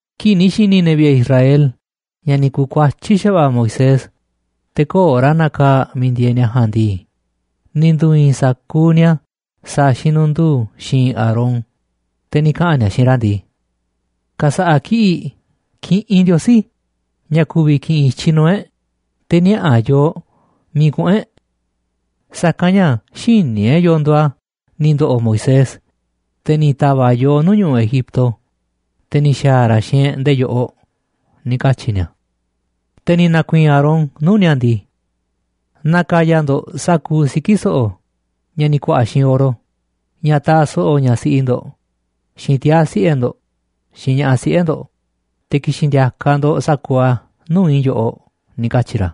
Kii̱ꞌ ni̱ xi̱ni̱ ne̱ vi̱ꞌe̱ Israel ña̱ ni̱ ku̱kuatyí xa̱va̱ꞌa̱ Moisés te̱ köo̱ꞌ ra̱ nakaa̱ꞌ miiꞌ ndieeꞌ ni̱a̱ ja̱a̱nꞌ ndii, ni̱ ndu̱i̱i̱n sa̱kuuꞌ ni̱a̱ sa̱a̱ xinunduu xi̱i̱nꞌ Aarón, te̱ ni̱ kaꞌa̱n ni̱a̱ xiinꞌ ra̱ ndii: ―Ka̱sa̱ꞌa̱ kiꞌi̱ꞌ kiꞌinꞌ ndiosí ña̱ ku̱vi̱ ki̱ꞌi̱n i̱tyiꞌ nuu̱ꞌ e̱ꞌ te̱ niaꞌa̱ a̱ yooꞌ miiꞌ kuꞌu̱n e̱ꞌ. Sa̱kanꞌ ña̱ xïní e̱ꞌ yo̱o̱ nduuꞌ a̱ ni̱ ndo̱ꞌo̱ Moisés, te̱ ni̱ ta̱va̱ꞌ yooꞌ nuu̱ꞌ ñu̱ꞌuꞌ Egipto, te̱ ni̱ xa̱a̱ ra̱ xiinꞌ e̱ꞌ nde̱e̱ yoꞌoꞌ ―ni̱ katyi̱ ni̱a̱. Te̱ ni̱ na̱ku̱i̱i̱n Aarón nuu̱ꞌ ni̱a̱ ndii: ―Na̱ka̱ya̱ ndo̱ꞌ sa̱kuuꞌ siki̱ so̱ꞌo̱ ña̱ ni̱ ku̱a̱ꞌa̱ xiinꞌ oro, ña̱ taaꞌ so̱ꞌo̱ ñaꞌ siꞌi ndo̱ꞌ, xiinꞌ tiaa̱ siꞌe̱ ndo̱ꞌ, xiinꞌ ña̱ꞌaꞌ siꞌe̱ ndo̱ꞌ, te̱ ki̱xi̱n ndi̱a̱ka̱ ndo̱ꞌ sa̱kuuꞌ a̱ nuu̱ꞌ i̱ yoꞌoꞌ ―ni̱ katyi̱ ra̱.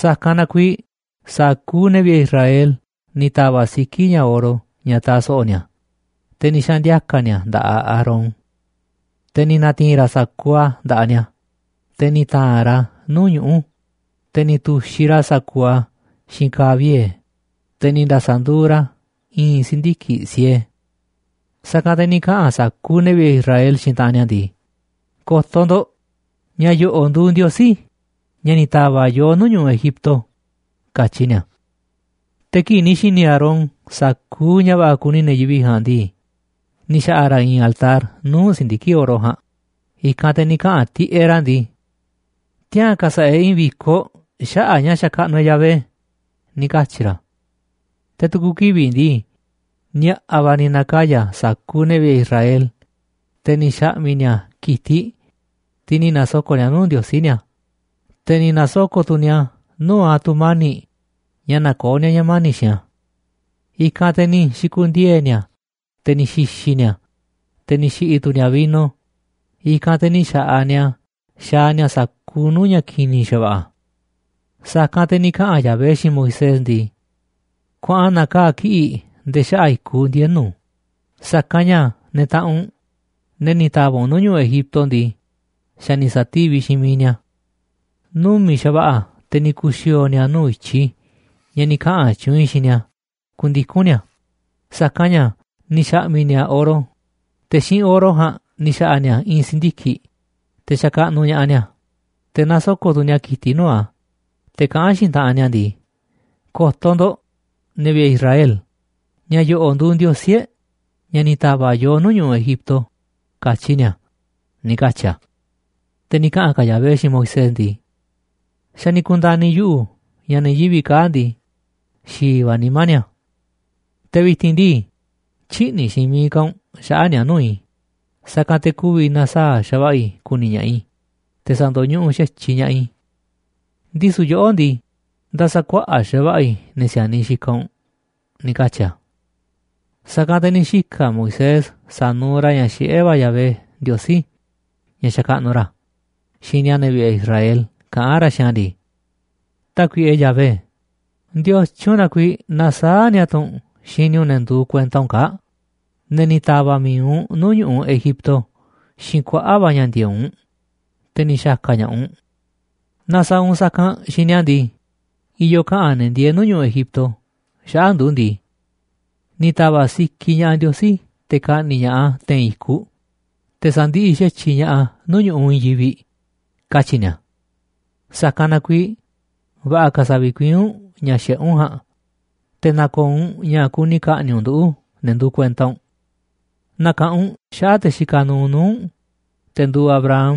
Sa̱kanꞌ na kuiiꞌ sa̱kuuꞌ ne̱ vi̱ꞌe̱ Israel ni̱ ta̱va̱ꞌ siki̱ ña̱ oro ña̱ taaꞌ so̱ꞌo̱ ni̱a̱, te̱ ni̱ xaꞌa̱n ndi̱a̱ka̱ ni̱a̱ a̱ nda̱ꞌaꞌ Aarón. Te̱ ni̱ na̱ti̱i̱n ra̱ sa̱kuuꞌ a̱ nda̱ꞌaꞌ ni̱a̱, te̱ ni̱ ta̱a̱nꞌ ra̱ a̱ nuu̱ꞌ ñuꞌu̱, te̱ ni̱ tu̱xiꞌ ra̱ sa̱kuuꞌ a̱ xiinꞌ ka̱a̱ vie̱, te̱ ni̱ nda̱sa̱nduuꞌ ra̱ a̱ i̱i̱n si̱ndiki̱ꞌ siee. Sa̱kanꞌ te̱ ni̱ kaꞌa̱n sa̱kuuꞌ ne̱ vi̱ꞌe̱ Israel xiinꞌ taꞌanꞌ ni̱a̱ ndii: ―Ko̱to̱ ndo̱ꞌ, ña̱ yo̱ꞌo̱ꞌ nduuꞌ ndiosí ña̱ ni̱ ta̱va̱ꞌ yooꞌ nuu̱ꞌ ñu̱ꞌuꞌ Egipto ―katyi ni̱a̱. Te̱ kii̱ꞌ ni̱ xi̱ni̱ Aarón sa̱kuuꞌ ña̱ va̱ꞌa̱ kuni ne̱ yivi̱ꞌ ja̱a̱nꞌ ndii, ni̱ xa̱ꞌa̱ ra̱ i̱i̱n altar nuu̱ꞌ si̱ndiki̱ꞌ oro ja̱a̱nꞌ, i̱kanꞌ te̱ ni̱ kaꞌa̱n tiꞌeꞌ ra̱ ndii: ―Tiaa̱n ka̱sa̱ꞌa̱ e̱ꞌ i̱i̱n vi̱koꞌ xaꞌa̱ꞌ a̱ ña̱ xakaꞌnuꞌ e̱ꞌ Yahvé ―ni̱ katyi̱ ra̱. Te̱ tu̱ku̱ kivi̱ꞌ ndii, ni̱a̱ꞌa̱ va̱ ni̱ na̱kaya̱ sa̱kuuꞌ ne̱ vi̱ꞌe̱ Israel, te̱ ni̱ xa̱ꞌmi̱ ni̱a̱ ki̱tiꞌ, tiꞌ ni̱ nasoko̱ꞌ ni̱a̱ nuu̱ꞌ ndiosí ni̱a̱, te̱ ni̱ na̱soko̱ꞌ tu̱ ni̱a̱ nuu̱ꞌ a̱ tu̱mani̱ꞌ ña̱ nakoó ni̱a̱ ña̱ mani̱ꞌ xiinꞌ a̱. I̱kanꞌ te̱ ni̱ xi̱ku̱ndiee̱ ni̱a̱, te̱ ni̱ xi̱xi̱ ni̱a̱, te̱ ni̱ xi̱ꞌi̱ tu̱ ni̱a̱ vino, i̱kanꞌ te̱ ni̱ xa̱ꞌaꞌ ni̱a̱ xaaꞌ ni̱a̱ sa̱kuuꞌ nuu̱ꞌ ña̱ ki̱ni̱ xa̱va̱ꞌa̱. Sa̱kanꞌ te̱ ni̱ kaꞌa̱n Yahvé xiinꞌ Moisés ndii: ―Kuaꞌan na̱kaa̱ꞌ kiꞌi̱ꞌ nde̱e̱ xaꞌa̱ꞌ i̱kuꞌ ndienu̱, sa̱kanꞌ ña̱ ne̱ taꞌanꞌ u̱nꞌ, ne̱ ni̱ ta̱va̱ꞌ u̱nꞌ nuu̱ꞌ ñu̱ꞌuꞌ Egipto ndii, xa̱ ni̱ sa̱tíviꞌ xiinꞌ miiꞌ ni̱a̱. Numi̱ꞌ xa̱va̱ꞌa̱ te̱ ni̱ ku̱xi̱o̱o̱ ni̱a̱ nuu̱ꞌ i̱tyiꞌ i̱ ña̱ ni̱ kaꞌa̱n tyuunꞌ i̱ xiinꞌ ni̱a̱ ku̱ndiku̱n ni̱a̱, sa̱kanꞌ ña̱ ni̱ xa̱ꞌmi̱ ni̱a̱ oro, te̱ xiinꞌ oro ja̱a̱nꞌ ni̱ xa̱ꞌa̱ ni̱a̱ i̱i̱n si̱ndiki̱ꞌ, te̱ xakaꞌnuꞌ ña̱ꞌaꞌ ni̱a̱, te̱ nasoko̱ꞌ tu̱ ni̱a̱ ki̱tiꞌ nuu̱ꞌ a̱, te̱ kaꞌán xiinꞌ taꞌanꞌ ni̱a̱ ndii: “¡Ko̱to̱ ndo̱ꞌ, ne̱ vi̱ꞌe̱ Israel, ña̱ yo̱ꞌo̱ꞌ nduuꞌ ndiosí e̱ꞌ ña̱ ni̱ ta̱va̱ꞌ yooꞌ nuu̱ꞌ ñu̱ꞌuꞌ Egipto!”, katyi ni̱a̱ ―ni̱ katyi̱ a̱. Te̱ ni̱ kaꞌa̱n ka̱ Yahvé xiinꞌ Moisés ndii: ―Xa̱ ni̱ ku̱nda̱ni̱ yuꞌu̱ ña̱ ne̱ yivi̱ꞌ kaa̱ꞌ ndii, xi̱i̱ va̱ nimá ni̱a̱. Te̱ vi̱ti̱n ndii, tyï̱ꞌni̱ xiinꞌ miiꞌ ka̱ u̱nꞌ xaꞌa̱ꞌ ni̱a̱ nuu̱ꞌ i̱, sa̱kanꞌ te̱ ku̱vi̱ na̱saa̱ꞌ xa̱va̱ꞌa̱ i̱ ku̱ni̱ ña̱ꞌaꞌ i̱ te̱ sa̱ndo̱ñuꞌuꞌ xa̱tyiꞌ ña̱ꞌaꞌ i̱. Ndisu̱ yoꞌó ndii, nda̱sa̱kuaꞌa̱ꞌ xa̱va̱ꞌa̱ i̱ ne̱ si̱a̱niꞌ xikaꞌ u̱nꞌ ―ni̱ katyi̱ a̱. Sa̱kanꞌ te̱ ni̱ xika̱ Moisés sa̱nuuꞌ ra̱ ña̱ xiꞌé va̱ Yahvé, Ndiosí, ña̱ xakaꞌnuꞌ ra̱, xini a̱ ne̱ vi̱ꞌe̱ Israel kaꞌán ra̱ xiinꞌ a̱ ndii: ―Tákuiꞌe Yahvé, ¿ndiotyun na kuiiꞌ nasaáꞌ nia tu̱ u̱nꞌ xini u̱nꞌ ne̱ nduuꞌ kuenta u̱nꞌ kaa̱ꞌ, ne̱ ni̱ ta̱va̱ꞌ mi̱iꞌ u̱nꞌ nuu̱ꞌ ñu̱ꞌuꞌ Egipto xiinꞌ kuaꞌa̱ꞌ va̱ ña̱ ndi̱e̱eꞌ u̱nꞌ, te̱ ni̱ xa̱ka̱ ña̱ꞌaꞌ u̱nꞌ? Naaꞌ sa̱a̱ u̱nꞌ sa̱kanꞌ xiinꞌ ni̱a̱ ndii, i̱yo̱ kaꞌa̱n ne̱ ndieeꞌ nuu̱ꞌ ñu̱ꞌuꞌ Egipto xaꞌa̱ꞌ ndu̱ ndii: “Ni̱ ta̱va̱ꞌ sikiꞌ ña̱ꞌaꞌ Ndiosí te̱ ka̱ꞌni̱ꞌ ña̱ꞌaꞌ a̱ te̱i̱n i̱kuꞌ, te̱ sa̱ndiꞌiꞌ xa̱tyiꞌ ña̱ꞌaꞌ a̱ nuu̱ꞌ ñu̱ꞌuꞌ i̱i̱n yivi̱ꞌ”, katyi̱ ni̱a̱. Sa̱kanꞌ na kuiiꞌ va̱ꞌa̱ ka̱ sa̱vikuiín u̱nꞌ ña̱ xiꞌé u̱nꞌ ja̱a̱nꞌ, te̱ na̱ko̱o̱ u̱nꞌ ña̱ kuni ka̱ꞌni̱ꞌ u̱nꞌ nduꞌu̱, ne̱ nduuꞌ kuenta u̱nꞌ. Na̱ka̱ꞌanꞌ u̱nꞌ xaꞌa̱ꞌ te̱ xikaꞌ nuuꞌ nuu̱ꞌ u̱nꞌ, te̱ nduuꞌ Abraham,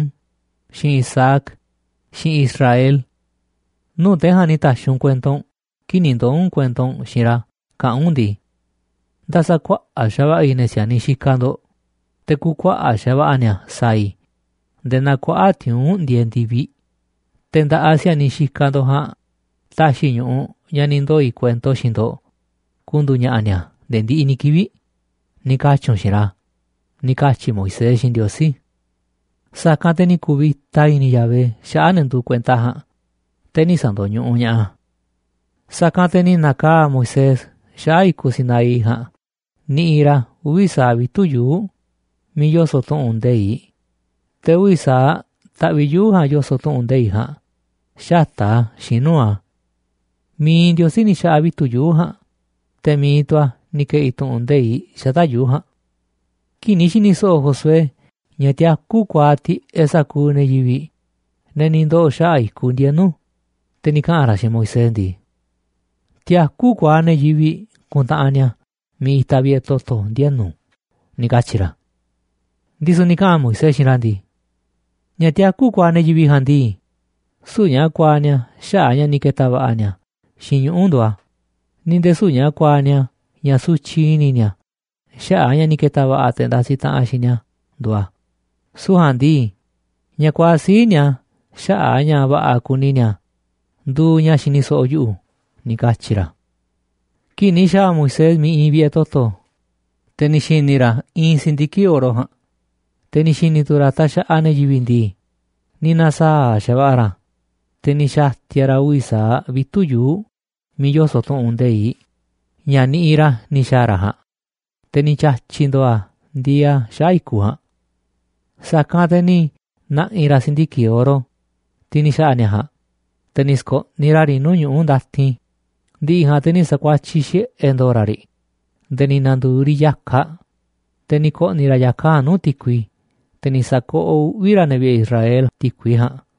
xiinꞌ Isaac, xiinꞌ Israel. Nuu̱ꞌ te̱ ja̱a̱nꞌ ni̱ ta̱xi̱ u̱nꞌ kuento u̱nꞌ kii̱ꞌ ni̱ ndoo̱ u̱nꞌ kuento u̱nꞌ xiinꞌ ra̱ kaꞌán u̱nꞌ ndii: “Nda̱sa̱kuaꞌa̱ꞌ xa̱va̱ꞌa̱ i̱ ne̱ si̱a̱niꞌ xikaꞌ ndo̱ꞌ, te̱ ku̱kuaꞌa̱ꞌ xa̱va̱ꞌa̱ ni̱a̱ sa̱a̱ i̱ nde̱e̱ naa kuaꞌa̱ꞌ tiuu̱nꞌ ndieeꞌ ndi̱viꞌ, te̱ nda̱ꞌaꞌ si̱a̱niꞌ xikaꞌ ndo̱ꞌ ja̱a̱nꞌ ta̱xi̱ i̱ ñu̱ꞌuꞌ ña̱ ni̱ ndoo̱ i̱ kuento xiinꞌ ndo̱ꞌ ku̱ndu̱u̱ ña̱ꞌa̱ ni̱a̱ nde̱e̱ ndiꞌiꞌ ni̱ kivi̱ꞌ”, ni̱ katyi̱ u̱nꞌ xiinꞌ ra̱ ―ni̱ katyi̱ Moisés xiinꞌ Ndiosí. Sa̱kanꞌ te̱ ni̱ ku̱vi̱ta i̱ni̱ Yahvé xaꞌa̱ꞌ ne̱ nduuꞌ kuenta a̱ ja̱a̱nꞌ, te̱ nï̱ sa̱ndo̱ñuꞌuꞌ ña̱ꞌaꞌ a̱. Sa̱kanꞌ te̱ ni̱ na̱kaa̱ꞌ Moisés xaꞌa̱ꞌ i̱kuꞌ Sinaí ja̱a̱nꞌ niꞌiꞌ ra̱ uvi̱ sa̱aꞌ vitu̱ꞌ yuu̱ꞌ miiꞌ yoso̱ꞌ tu̱ꞌu̱n nde̱iꞌ, te̱ uvi̱ sa̱aꞌ taꞌviꞌ yuu̱ꞌ ja̱a̱nꞌ yoso̱ꞌ tu̱ꞌu̱n nde̱iꞌ ja̱a̱nꞌ xata̱ꞌ a̱ xiinꞌ nuu̱ꞌ a̱. Mi̱iꞌ Ndiosí ni̱ xa̱ꞌa̱ vitu̱ꞌ yuu̱ꞌ ja̱a̱nꞌ, te̱ mi̱iꞌ tu̱ a̱ ni̱ ke̱ꞌi̱ tu̱ꞌu̱n nde̱iꞌ xata̱ꞌ yuu̱ꞌ ja̱a̱nꞌ. Kii̱ꞌ ni̱ xi̱ni̱ so̱ꞌo̱ Josué ña̱ tiakú kuaaꞌ tiꞌeꞌ sa̱kuuꞌ ne̱ yivi̱ꞌ, ne̱ ni̱ ndoo̱ xaꞌa̱ꞌ i̱kuꞌ ndienu̱, te̱ ni̱ kaꞌa̱n ra̱ xiinꞌ Moisés ndii: ―Tiakú kuaaꞌ ne̱ yivi̱ꞌ kuntaꞌanꞌ ni̱a̱ miiꞌ itaꞌ vi̱ꞌe̱ toto̱ ndienu̱ ―ni̱ katyi̱ ra̱. Ndisu̱ ni̱ kaꞌa̱n Moisés xiinꞌ ra̱ ndii: ―Ña̱ tiakú kuaaꞌ ne̱ yivi̱ꞌ ja̱a̱nꞌ ndii, süu̱ꞌ ña̱ kuaaꞌ ni̱a̱ xaꞌa̱ꞌ a̱ ña̱ ni̱ ke̱ta̱ va̱ꞌa̱ ni̱a̱ xiinꞌ ñuꞌu̱ nduuꞌ a̱, ni̱ nde̱e̱ süu̱ꞌ ña̱ kuaaꞌ ni̱a̱ ña̱ sutyiꞌ i̱ni̱ ni̱a̱ xaꞌa̱ꞌ a̱ ña̱ ni̱ ke̱ta̱ va̱ꞌa̱ te̱ ndasiꞌ taꞌanꞌ xiinꞌ ni̱a̱ nduuꞌ a̱, süu̱ꞌ ja̱a̱nꞌ ndii, ña̱ kuaaꞌ sii̱ꞌ ni̱a̱ xaꞌa̱ꞌ a̱ ña̱ va̱ꞌa̱ kuni ni̱a̱ nduuꞌ ña̱ xini so̱ꞌo̱ yuꞌu̱ ―ni̱ katyi̱ ra̱. Kii̱ꞌ ni̱ xa̱a̱ Moisés miiꞌ iinꞌ vi̱ꞌe̱ toto̱, te̱ ni̱ xi̱ni̱ ra̱ iinꞌ si̱ndiki̱ꞌ oro ja̱a̱nꞌ, te̱ ni̱ xi̱ni̱ tu̱ ra̱ taxaꞌaꞌ ne̱ yivi̱ꞌ ndii, ni̱ na̱saa̱ꞌ xa̱va̱ꞌa̱ ra̱, te̱ ni̱ xa̱ti̱a̱ ra̱ uvi̱ sa̱aꞌ vitu̱ꞌ yuu̱ꞌ miiꞌ yoso̱ꞌ tu̱ꞌu̱n nde̱iꞌ, ña̱ niꞌiꞌ ra̱ ni̱ xa̱a̱ ra̱ ja̱a̱nꞌ, te̱ ni̱ tya̱tyi̱ ndo̱o̱ a̱ ndieeꞌ a̱ xaꞌa̱ꞌ i̱kuꞌ ja̱a̱nꞌ. Sa̱kanꞌ te̱ ni̱ na̱ꞌi̱ ra̱ si̱ndiki̱ꞌ oro, tiꞌ ni̱ xa̱ꞌa̱ ni̱a̱ ja̱a̱nꞌ, te̱ ni̱ sko̱ꞌniꞌ ra̱ riꞌ nuu̱ꞌ ñuꞌu̱ ndatin, ndi̱ꞌi̱ ja̱a̱nꞌ te̱ ni̱ sa̱kuatyiꞌ xiꞌe̱ ndo̱o̱ ra̱ riꞌ nde̱e̱ ni̱ na̱ndu̱u̱ riꞌ ya̱kaꞌ, te̱ ni̱ ko̱ꞌni̱ ra̱ ya̱kaꞌ ja̱a̱nꞌ nuu̱ꞌ ti̱kui, te̱ ni̱ sa̱koꞌoꞌ uꞌvi̱ ra̱ ne̱ vi̱ꞌe̱ Israel ti̱kui ja̱a̱nꞌ.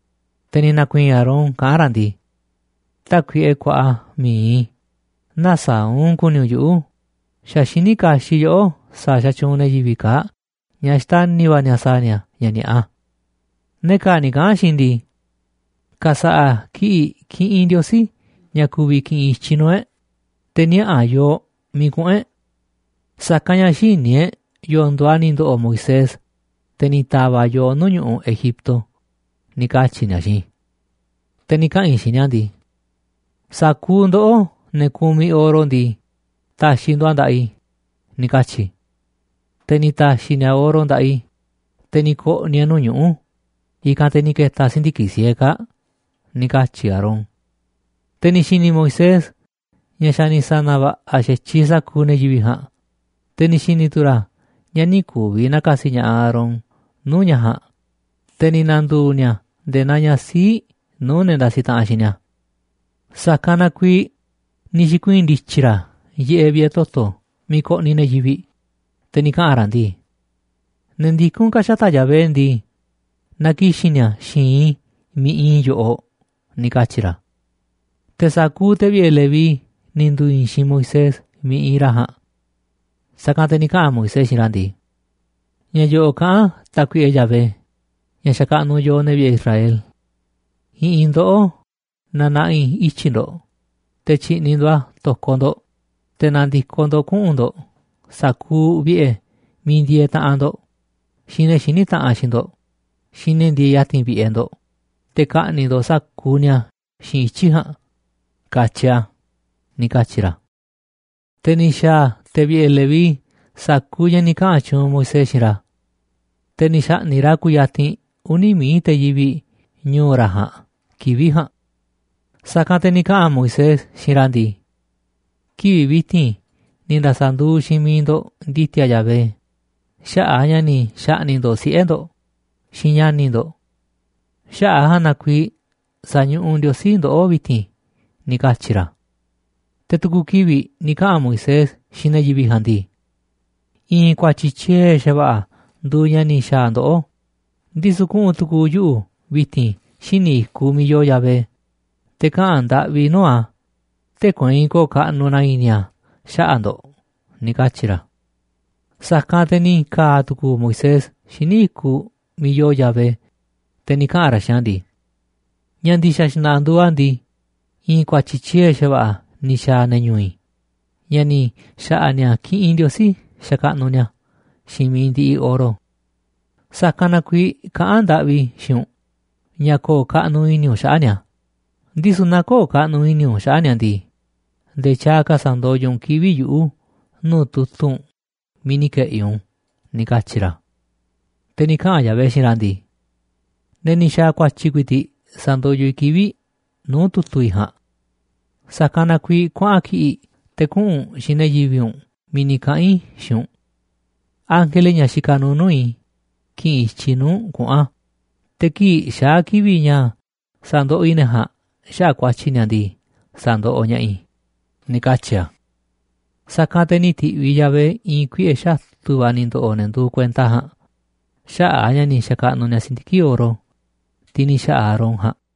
Te̱ ni̱ na̱ku̱i̱i̱n Aarón kaꞌán ra̱ ndii: ―Tákuiꞌe kuaꞌa mi̱iꞌ i̱, nä̱saa̱ꞌ u̱nꞌ ku̱ni̱ u̱nꞌ yuꞌu̱, xa̱ xiní kaxiꞌ yoꞌó sa̱a̱ xatyuunꞌ ne̱ yivi̱ꞌ kaa̱ꞌ ña̱ xtani̱ va̱ ni̱a̱ sa̱a̱ ni̱a̱ ña̱ ni̱a̱ꞌa. Ne̱ kaa̱ꞌ ni̱ kaꞌa̱n xiinꞌ i̱ ndii: “Ka̱sa̱ꞌa̱ kiꞌi̱ꞌ kiꞌinꞌ ndiosí ña̱ ku̱vi̱ ki̱ꞌi̱n i̱tyiꞌ nuu̱ꞌ e̱ꞌ, te̱ niaꞌa̱ a̱ yooꞌ miiꞌ kuꞌu̱n e̱ꞌ. Sa̱kanꞌ ña̱ xïní e̱ꞌ yo̱o̱ nduuꞌ a̱ ni̱ ndo̱ꞌo̱ Moisés, te̱ ni̱ ta̱va̱ꞌ yooꞌ nuu̱ꞌ ñu̱ꞌuꞌ Egipto”, ni̱ katyi̱ ni̱a̱ xiinꞌ i̱. Te̱ ni̱ kaꞌa̱n i̱ xiinꞌ ni̱a̱ ndii: “Sa̱kuuꞌ ndoꞌó, ne̱ kumiꞌ oro ndii, ta̱xi̱ ndo̱ꞌ a̱ nda̱ꞌaꞌ i̱”, ni̱ katyi̱ i̱. Te̱ ni̱ ta̱xi̱ ni̱a̱ oro nda̱ꞌaꞌ i̱, te̱ ni̱ ko̱ꞌni̱ e̱ꞌ nuu̱ꞌ ñu̱ꞌuꞌ, i̱kanꞌ te̱ ni̱ ke̱ta̱ si̱ndiki̱ꞌ siee kaa̱ꞌ ―ni̱ katyi̱ Aarón. Te̱ ni̱ xi̱ni̱ Moisés ña̱ xa̱ ni̱ sa̱na̱ va̱ꞌa̱ xa̱tyiꞌ sa̱kuuꞌ ne̱ yivi̱ꞌ ja̱a̱nꞌ, te̱ ni̱ xi̱ni̱ tu̱ ra̱ ña̱ nï̱ ku̱vi̱ na̱ka̱si̱ ña̱ꞌaꞌ Aarón nuu̱ꞌ ña̱ ja̱a̱nꞌ, te̱ ni̱ na̱ndu̱u̱ ni̱a̱ nde̱e̱ naa ña̱ sii̱ꞌ nuu̱ꞌ ne̱ ndasiꞌ taꞌanꞌ xiinꞌ ni̱a̱. Sa̱kanꞌ na kuiiꞌ ni̱ xi̱kuii̱n ndi̱tyi̱ ra̱ yiꞌeꞌ vi̱ꞌe̱ toto̱ miiꞌ koꞌniꞌ ne̱ yivi̱ꞌ, te̱ ni̱ kaꞌa̱n ra̱ ndii: ―Ne̱ ndikún ka̱ xata̱ꞌ Yahvé ndii, na ki̱xi̱n ni̱a̱ xi̱i̱nꞌ i̱ miiꞌ iinꞌ i̱ yoꞌoꞌ ―ni̱ katyi̱ ra̱. Te̱ sa̱kuuꞌ te̱ vi̱ꞌe̱ Leví ni̱ ndu̱u̱ i̱i̱n xiinꞌ Moisés miiꞌ iinꞌ ra̱ ja̱a̱nꞌ. Sa̱kanꞌ te̱ ni̱ kaꞌa̱n Moisés xiinꞌ ra̱ ndii: ―Ña̱ yo̱ꞌo̱ꞌ kaꞌán Tákuiꞌe Yahvé, ña̱ xakaꞌnuꞌ yooꞌ, ne̱ vi̱ꞌe̱ Israel: “I̱ꞌi̱n ndoꞌó na na̱ꞌi̱ ityi̱ ndo̱ꞌ te̱ tyi̱ꞌni̱ ndo̱ꞌ a̱ to̱koꞌ ndo̱ꞌ, te̱ na̱ndi̱koꞌ ndo̱ꞌ kuꞌu̱n ndo̱ꞌ sa̱kuuꞌ vi̱ꞌe̱ miiꞌ ndieeꞌ taꞌanꞌ ndo̱ꞌ, xiinꞌ ne̱ xiní taꞌanꞌ xiinꞌ ndo̱ꞌ, xiinꞌ ne̱ ndieeꞌ ya̱ti̱n vi̱ꞌe̱ ndo̱ꞌ, te̱ ka̱ꞌni̱ꞌ ndo̱ꞌ sa̱kuuꞌ ni̱a̱ xiinꞌ ityi̱ ja̱a̱nꞌ”, katyi a̱ ―ni̱ katyi̱ ra̱. Te̱ ni̱ xa̱a̱ ne̱ vi̱ꞌe̱ Leví sa̱kuuꞌ ña̱ ni̱ kaꞌa̱n tyuunꞌ Moisés xiinꞌ ra̱. Te̱ ni̱ xa̱ꞌni̱ꞌ ra̱ kuyatinꞌ uni̱ mií te̱ yivi̱ꞌ ñu̱u̱ ra̱ ja̱a̱nꞌ kivi̱ꞌ ja̱a̱nꞌ. Sa̱kanꞌ te̱ ni̱ kaꞌa̱n Moisés xiinꞌ ra̱ ndii: ―Kivi̱ꞌ vi̱ti̱n ni̱ nda̱sa̱nduuꞌ xiinꞌ miiꞌ ndo̱ꞌ ndi̱ti̱a̱ Yahvé xaꞌa̱ꞌ a̱ ña̱ ni̱ xa̱ꞌni̱ꞌ ndo̱ꞌ siꞌe̱ ndo̱ꞌ xiinꞌ ña̱ni̱ ndo̱ꞌ. Xaꞌa̱ꞌ a̱ ja̱a̱nꞌ na kuiiꞌ sañuꞌuꞌ Ndiosí ndoꞌó vi̱ti̱n ―ni̱ katyi̱ ra̱. Te̱ tu̱ku̱ kivi̱ꞌ ni̱ kaꞌa̱n Moisés xiinꞌ ne̱ yivi̱ꞌ ja̱a̱nꞌ ndii: ―I̱i̱n ku̱a̱tyi̱ tyiee̱ xa̱va̱ꞌa̱ nduuꞌ ña̱ ni̱ xa̱a̱ ndoꞌó, ndisu̱ kuꞌu̱n tu̱ku̱u̱ yuꞌu̱ vi̱ti̱n xíniꞌ i̱kuꞌ miiꞌ yoo Yahvé, te̱ kaꞌa̱n ndaꞌvi i̱ nuu̱ꞌ a̱, tee̱ꞌ kueinꞌ ko̱o̱ kaꞌnuꞌ na i̱ni̱ a̱ xaꞌa̱ꞌ ndo̱ꞌ ―ni̱ katyi̱ ra̱. Sa̱kanꞌ te̱ ni̱ ka̱a̱ tu̱ku̱u̱ Moisés xíniꞌ i̱kuꞌ miiꞌ yoo Yahvé, te̱ ni̱ kaꞌa̱n ra̱ xiinꞌ a̱ ndii: ―Ña̱ ndi̱xa̱ xna̱ꞌa̱ nduuꞌ a̱ ndii, i̱i̱n ku̱a̱tyi̱ tyiee̱ xa̱va̱ꞌa̱ ni̱ xa̱a̱ ne̱ ñu̱u̱ i̱ ña̱ ni̱ xa̱ꞌa̱ ni̱a̱ kiꞌinꞌ ndiosí sa̱kaꞌnuꞌ ni̱a̱ xiinꞌ mi̱iꞌ ndiꞌiꞌ oro. Sa̱kanꞌ na kuiiꞌ kaꞌán ndaꞌvi i̱ xiinꞌ u̱nꞌ ña̱ ko̱o̱ kaꞌnuꞌ i̱ni̱ u̱nꞌ xaꞌa̱ꞌ ni̱a̱, ndisu̱ naaꞌ köo̱ꞌ kaꞌnuꞌ i̱ni̱ u̱nꞌ xaꞌa̱ꞌ ni̱a̱ ndii, nde̱e̱ tyaaꞌ ka̱ sa̱ndoyoꞌ tu̱ u̱nꞌ kivi̱ꞌ yuꞌu̱ nuu̱ꞌ tu̱tu̱ u̱nꞌ miiꞌ ni̱ ke̱ꞌi̱ u̱nꞌ u̱n ―ni̱ katyi̱ ra̱. Te̱ ni̱ kaꞌa̱n Yahvé xiinꞌ ra̱ ndii: ―Ne̱ ni̱ xa̱a̱ ku̱a̱tyi̱ ku̱i̱ti̱ꞌ sa̱ndoyoꞌ i̱ kivi̱ꞌ nuu̱ꞌ tu̱tu̱ i̱ ja̱a̱nꞌ. Sa̱kanꞌ na kuiiꞌ kuaꞌan kiꞌi̱ꞌ te̱ kuꞌu̱n u̱nꞌ xiinꞌ ne̱ yivi̱ꞌ u̱nꞌ miiꞌ ni̱ kaꞌa̱n i̱ xiinꞌ u̱nꞌ. Ángele, ña̱ xikaꞌ nuuꞌ nuu̱ꞌ i̱, ki̱ꞌi̱n i̱tyiꞌ nuu̱ꞌ u̱nꞌ kuꞌu̱n a̱, te̱ kii̱ꞌ xaa̱ kivi̱ꞌ ña̱ sa̱ndoꞌoꞌ i̱ ne̱ ja̱a̱nꞌ xaꞌa̱ꞌ ku̱a̱tyi̱ ni̱a̱ ndii, sa̱ndoꞌoꞌ ña̱ꞌaꞌ i̱ ―ni̱ katyi̱ a̱. Sa̱kanꞌ te̱ ni̱ ti̱ꞌviꞌ Yahvé i̱i̱n kuiꞌe̱ xatu̱ va̱ ni̱ ndo̱ꞌo̱ ne̱ nduuꞌ kuenta a̱ ja̱a̱nꞌ xaꞌa̱ꞌ a̱ ña̱ ni̱ xa̱kaꞌnuꞌ ni̱a̱ si̱ndiki̱ꞌ oro, tiꞌ ni̱ xa̱ꞌa̱ Aarón ja̱a̱nꞌ.